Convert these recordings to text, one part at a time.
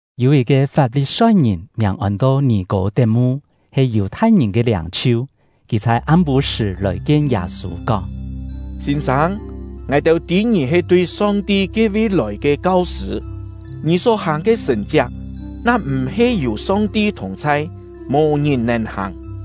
Yû yit-ke Fap-li-soi-ngìn, miàng ôn-to Nì-kô-tet-mu, he Yù-thai-ngìn ke liâng-chhiu. Kì chhai am-pû-sṳ̀ lòi-kien Yâ-sû, kóng: “Sîn-sâng, ngài-têu tî ngì he tui Song-ti ke-vi lòi ke kau-sṳ̂. Ngì só-hàng ke sṳ̀n-chiak, na-m̀-he yû Song-ti thùng-chhai, mò ngìn nèn hàng.”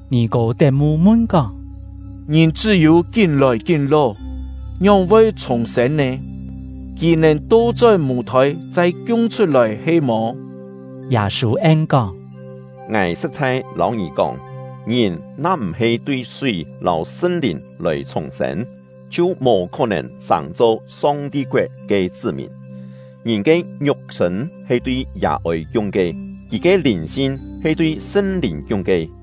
Nì-kô-tet-mu mun-kóng: “Ngìn chṳ́-yû kín lòi kín ló, ngióng-voi chhùng-sên nè? Kì nèn to-chón mû-thôi chai kiung-chhut-lòi he-mò?” Yâ-sû en-kóng: “Ngài sṳ̍t-chhai lâu ngì kóng, ngìn na-m̀-he tui súi lâu Sṳn-Lìn lòi chhùng-sên, chhiu mò khó-nèn sàng-cho Song-ti koet ke chṳ́-mìn. Ngìn ke ngiuk-sṳ̂n he tui yà-ôi kiung ke, kì ke lìn-sin he tui Sṳn-Lìn kiung ke.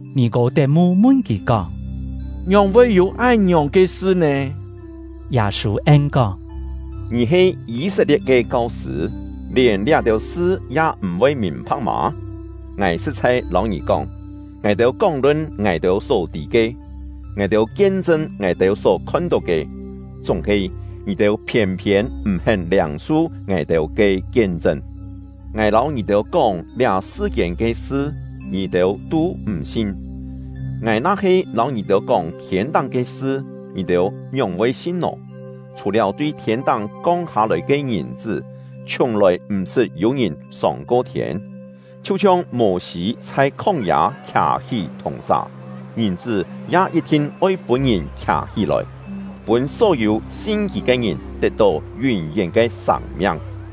Nì-kô-tet-mu mun kì kóng: “Ngióng-voi yû án-ngiòng ke sṳ nè?” Yâ-sû en-kóng: “Ngì he Yî-set-lie̍t ke kau-sṳ̂, lièn liá-têu sṳ ya m̀-voi mìn-pha̍k mâ? Ngài sṳ̍t-chhai lâu ngì kóng, ngài-têu kóng-lun ngài-têu só tî ke, ngài-têu kien-chṳn ngài-têu só khon-tó ke; chúng-he ngì-têu phiên-phiên m̀-hén liâng-su ngài-têu ke kien-chṳn. Ngài lâu ngì-têu kóng liá sṳ-kiên ke sṳ, ngì-têu tû m̀ sin; ngài na-he lâu ngì-têu kóng thiên-táng ke sṳ, ngì-têu ngióng-voi sin nò? Chhù-liáu tui thiên-táng kong hâ-lòi ke Ngìn-chṳ́, chhiùng-lòi m̀-sṳt yû ngìn sông-ko thiên. Chhiu-chhiong Mô-sî chhai khóng-yâ khià-hí thùng-sà, Ngìn-chṳ́ ya yit-thin oi pûn-ngìn khià-hí-lòi, pûn só-yû sin kì ke ngìn tet-tó yún-yén ke sâng-miang.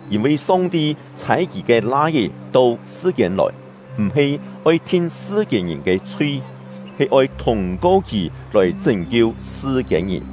“Yîn-vi Song-ti chhâi Kì ke Lai-é to sṳ-kiên lòi, m̀-he oi thin sṳ-kiên-ngìn ke chhui, he oi thûng-ko kì lòi chṳ́n-kiu sṳ-kiên-ngìn.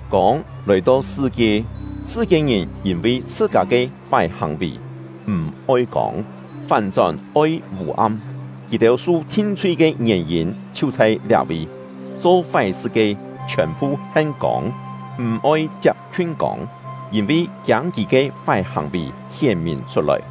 Kông lòi-to sṳ-kie, sṳ-kiên-ngìn yîn-vi chhṳ-kâ ke fái hàng-vì, m̀ oi kông, fán-chón oi vû-am; kì-têu su thin-chhui ke ngièn-yîn chhiu chhai liá-vi. Cho fái-sṳ ke, chhiòn-phu hen kông, m̀ oi chiap-khiun kông, yîn-vi kiâng kì ke fái hàng-vì hién-mìn chhut-lòi.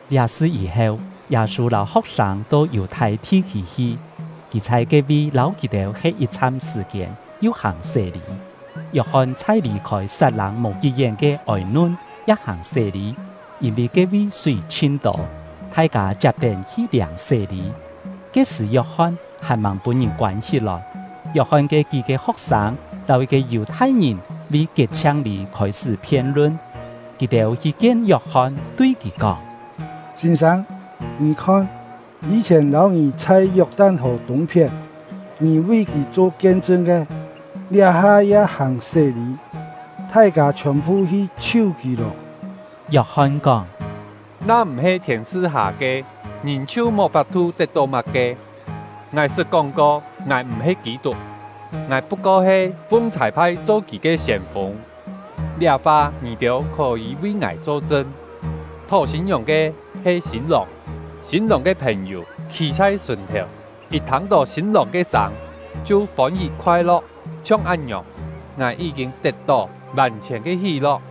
Liá sṳ yî-heu, Yâ-sû lâu ho̍k-sâng to Yù-thai thi-khî hi. Kì chhai ke-vi lâu kì-têu he̍t yit-chham sṳ̀-kiên, yu hàng sé-lî. Yok-hon chhai lì-khôi Sat-lâng mò kí-yén ke Ôi-nun ya hàng sé-lî, yîn-vi ke-vi súi chhin tô; thai-kâ chiap-tén hi liâng sé-lî. (Ke-sṳ̀ Yok-hon hàn-màng pûn-ngìn koân hí-lòi.) Yok-hon ke kí-ke ho̍k-sâng lâu yit-ke Yù-thai-ngìn vi kiet-chhiang-lî khôi-sṳ́ phien-lun. Kì-têu hi kien Yok-hon, tui kì kóng: “Sîn-sâng, ngì khon, yî-chhièn lâu ngì chhai Yok-tan-hò tûng-phién, ngì vi kì cho kien-chṳn ke, liá-ha ya hàng sé-lî, thai-kâ chhiòn-phu hi chhiu kì lô!” Yok-hon kóng: “Na-m̀-he Thiên su-hâ ke, ngìn chhiu mò fap-thu tet-tó má-ke. Ngài sṳt kóng-ko: ‘Ngài m̀-he Kî-tuk; ngài put-ko he fung chhâi-phai cho kì ke siên-fûng.’ Liá fa ngì-têu khó-yî vi ngài cho-chṳn. Thó sîn-ngiòng ke he sîn-lòng; sîn-lòng ke phèn-yû khî chhai sùn-thèu, yit thâng-tó sîn-lòng ke sâng chhiu fôn-hí khoai-lo̍k. Chhiong án-ngiòng, ngài yí-kîn tet-tó vàn-chhiòn ke hí-lo̍k.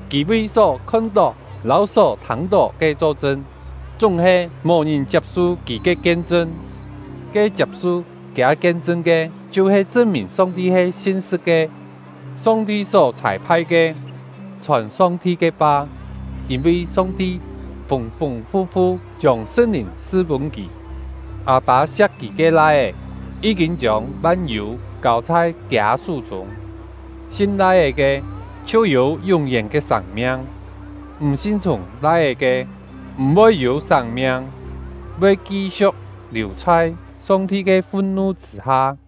Kì vi só khon-tó lâu só thâng-tó ke cho-chṳn, chúng-he mò-ngìn chiap-su kì ke kien-chṳn. Ke chiap-su kiâ kien-chṳn ke, chhiu-he chṳn-mìn Song-ti he sin-sṳ̍t ke. Song-ti só chhâi-phai ke, chhòn Song-ti ke fa, yîn-vi Song-ti fûng-fûng fu-fu chiông Sṳn-Lìn su-pûn kì. Â-pâ siak Kì ke Lai-é, yí-kîn chiông van-yû kâu chhai kiâ sú-chûng. Sin Lai-é ke, chhiu yû yún-yén ke sâng-miang; m̀ sin-chhiùng Lai-é ke, m̀-voi yû sâng-miang, voi ki-siu̍k liù chhai Song-ti ke fun-nu chṳ̂-ha.